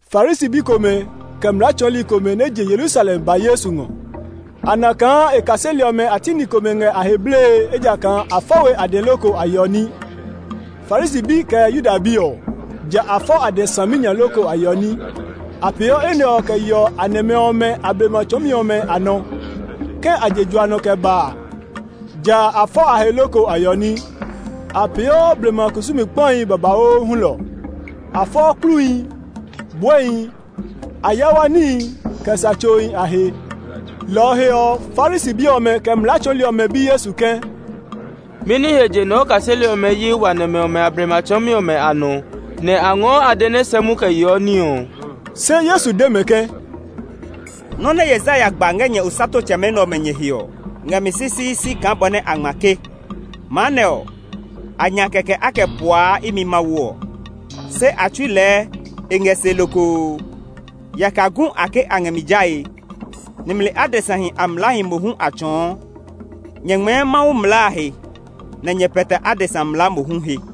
Farisi bi komɛ, kɛ mlaa tsɔɔli komɛ nɛ je Yerusalem ba Yesu ngɔ. A na kaa e kaseli ɔmɛ a ti ni komɛ ngɛ a he blee ejakaa a fɔ we a dɛ loko a yeɔ ní. (Farisi bi kɛ Yuda bi ɔ, ja a fɔ a dɛ saminya loko a yeɔ ní; a peeɔ enɛ ɔ kɛ yeɔ a nɛmɛ ɔmɛ a blema tsɔɔmi ɔmɛ a nɔ. Ke a je jua nɔ kɛ ba a, ja a fɔ a he loko a yeɔ ní. A peeɔ blema kusumi kpahi babauu hulɔ. A fɔɔ kpluhi, buɛhi, ayawa níhi [kɛ sa tsohi] a he.) Lɔ ɔ he ɔ, Farisi bi ɔmɛ, kɛ mlaa tsɔɔli ɔmɛ bi Yesu ke, “Mɛni he je nɛ o kaseli ɔmɛ yi wa nɛmɛ ɔmɛ a blema tsɔɔmi ɔmɛ a nɔ, nɛ a ngɔɔ a dɛ nɛ sɛ mu kɛ yeɔ ní ɔ?” Se Yesu de mɛ ke, “Nɔ́ nɛ Yesaya gba ngɛ nyɛ osatotsɛmɛ nɛ ɔmɛ nyɛ he ɔ ngɛ mi sisiisi kaa bɔ nɛ a ngma ke, ‘Ma nɛ ɔ, a nya kɛkɛ a kɛ puaa imi Mawu ɔ, se a tsui lɛɛ e ngɛ se lokoo. Yaka gu a ke a ngɛ mi jae; nimli adesahi a mlaahi mohu a tsɔɔ!’ “Nyɛ ngmɛɛ Mawu mlaa a he nɛ nyɛ pɛtɛ adesa mlaa mohu he.”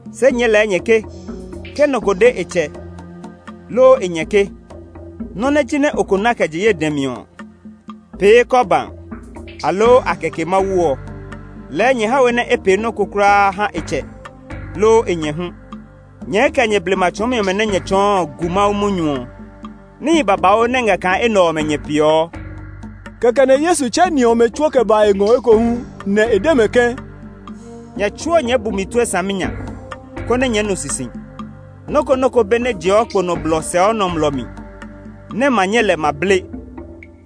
Se nyɛɛ lɛ nyɛ ke, ke nɔ ko de e tsɛ, loo e nyɛ ke, Nɔ́ nɛ jinɛ o ko na kɛ je ye dɛ mi ɔ pee ‘Korban’, aloo a kɛ ke Mawu ɔ, lɛɛ nyɛ ha we nɛ e pee nɔ́ ko kulaa ha e tsɛ, loo e nyɛ hu. Nyɛɛ kɛ nyɛ blema tsɔɔmi ɔmɛ nɛ nyɛ tsɔɔ ɔ gu Mawu munyu ɔ. Níhi babauu nɛ ngɛ kaa enɛ ɔmɛ nyɛ peeɔ.” Kɛkɛ nɛ Yesu tsɛ ni ɔmɛ tsuo kɛ ba e ngɔ ekohu, nɛ e de mɛ ke, “Nyɛ tsuo nyɛɛ bu mi tue saminya, konɛ nyɛɛ nu sisi. Nɔ́ ko nɔ́ ko be nɛ jeɔ kpo nɔ blɔ sɛɔ nɔmlɔ mi nɛ ma nyɛ lɛ ma ble;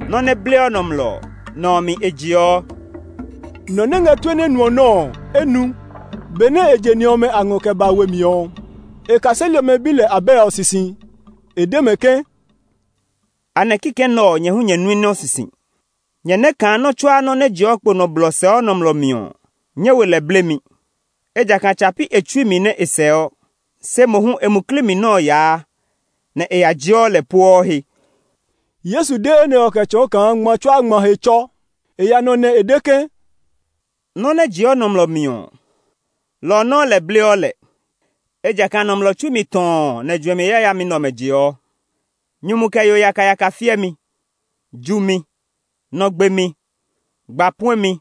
nɔ́ nɛ bleɔ nɔmlɔ ɔ, nɔ ɔ mi e jeɔ.” [ Nɔ nɛ ngɛ tue nɛ nuɔ nɔ́ ɔ, e nu.] Benɛ e je ni ɔmɛ a ngɔ kɛ ba we mi ɔ, e kaseli ɔmɛ bi lɛ abɛ ɔ sisi. E de mɛ ke, “Anɛ kikɛ nɛ ɔ nyɛ hu nyɛ nui nɔ sisi! Nyɛ nɛ́ kaa nɔ́ tsuaa nɔ́ nɛ jeɔ kpo nɔ blɔ sɛɔ nɔmlɔ mi ɔ nyɛ we lɛ blemi, ejakaa tsa pi e tsui mi nɛ e sɛɔ, se mohu e muklii mi nɔ́ ɔ yaa, nɛ e ya jeɔ lɛ pueɔ he.” Yesu de enɛ ɔ kɛ tsɔɔ kaa ngma tsuaa ngma he tsɔ. E ya nɔ nɛ e de ke, “Nɔ́ nɛ jeɔ nɔmlɔ mi ɔ, lɔ ɔ nɔuu lɛ bleɔ lɛ. Ejakaa nɔmlɔ tsui mi tɔɔ nɛ juɛmi yayami nɛ ɔmɛ jeɔ: nyumu kɛ yo yakayaka fiɛmi, jumi, nɔ gbemi, gba puɛmi,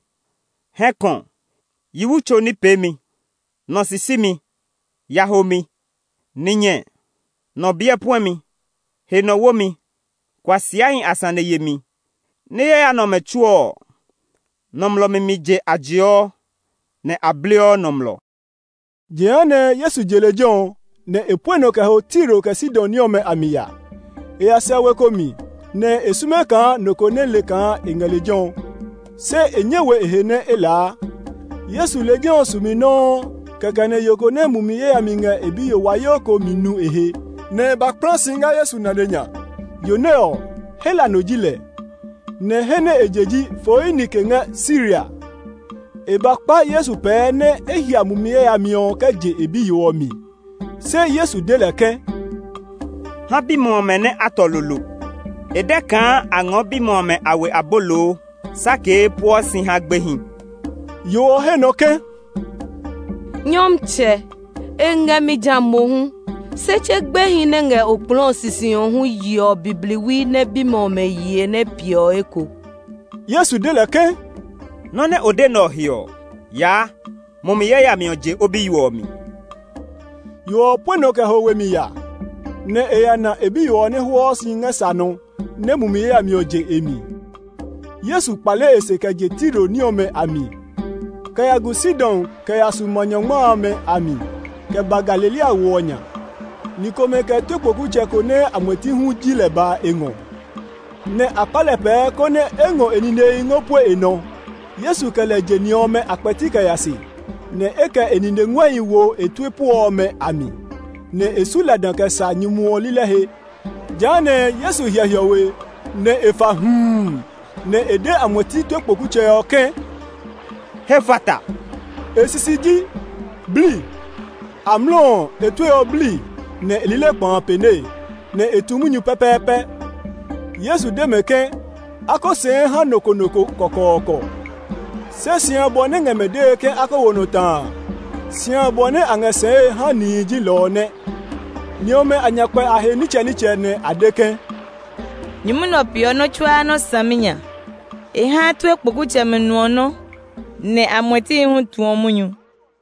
hɛkɔ, yi wu tso ní peemi, nɔ sisimi, yahomi, ninyɛ, nɔ biɛ puɛmi, he nɔ womi, kuasiahi a sane yemi. Ní yaya nɛ ɔmɛ tsuo ɔ, nɔmlɔ mi mi je a jeɔ, nɛ a bleɔ nɔmlɔ.” Jehanɛ Yesu je lejɛ ɔ, nɛ e pue nɔ kɛ ho Tiro kɛ Sidon ní ɔmɛ a mi ya. E ya sɛ we ko mi, nɛ e sume kaa nɔ ko nɛ le kaa e ngɛ lejɛ ɔ; se e nyɛ we e he nɛ e laa. Yesu lejɛ ɔ sumi nɔuu kɛkɛ nɛ yo ko nɛ mumi yayami ngɛ e biyo wayoo ko mi nu e he, nɛ e ba kpla si ngɛ Yesu nane nya. Yo nɛ ɔ, Hela no ji lɛ, nɛ he nɛ e je ji Foinike ngɛ Siria. E ba kpa Yesu pɛɛ nɛ́ e hia mumi yayami ɔ kɛ je e biyo ɔ mi. Se Yesu de lɛ ke, “Ha bimɛ ɔmɛ nɛ a tɔ lolo. E dɛ kaa a ngɔɔ bimɛ ɔmɛ a we abolo sakee pueɔ si ha gbehi.” Yo ɔ he nɔ ke, “Nyɔmtsɛ, e ngɛ mi ja mohu, se tse gbehi nɛ ngɛ okplɔɔ ɔ sisi ɔ hu yeɔ bibliwi nɛ bimɛ ɔmɛ ye piɛ ɔ eko!” Yesu de lɛ ke, “Nɔ́ nɛ o de nɛ ɔ he ɔ, yaa! Mumi yayami ɔ je o biyo ɔ mi.” Yo ɔ pue nɔ kɛ ho we mi ya, nɛ e ya na e biyo ɔ nɛ hwɔɔ si ngɛ sa nɔ nɛ́ mumi yayami ɔ je e mi. Yesu kpale e se kɛ je Tiro ní ɔmɛ a mi, kɛ ya gu Sidon kɛ ya su Ma Nyɔngma amɛ a mi, kɛ ba Galilea wo ɔ nya. Ni komɛ kɛ tue kpokutsɛ ko nɛ amuɛti hu ji lɛ ba e ngɔ; nɛ a kpa lɛ pɛɛ konɛ e ngɔ e ninehi ngɔ pue e nɔ. Yesu kɛ lɛ je ni ɔmɛ a kpɛti kɛ ya se, nɛ e kɛ e nine nguɛhi wo e tue puɔ ɔmɛ a mi, nɛ e su lada kɛ sa nyumu ɔ lilɛ he. Jehanɛ Yesu hyɛ hiɔwe, nɛ e fa huu, nɛ e de amuɛti tue kpokutsɛ ɔ ke, “Hefata”. E sisi ji, “Bli!” Amlɔ ɔ, e tue ɔ bli, nɛ e lilɛ kpa a pɛne, nɛ e tu munyu pɛpɛɛpɛ. Yesu de mɛ ke a ko sɛɛ ha nɔ ko nɔ ko kɔkɔɔkɔ; se si abɔ nɛ e ngɛ mɛ dee ke a ko wo nɔ ta a, si abɔ nɛ a ngɛ sɛɛe ha nihi ji lɔ ɔ nɛ. Ni ɔmɛ a nya kpɛ a he nitsɛnitsɛ, nɛ a de ke, “Nyumu nɛ ɔ peeɔ nɔ́ tsuaa nɔ́ saminya! E haa tue kpokutsɛmɛ nuɔ nɔ́, nɛ amuɛtihi hu tuɔ munyu!”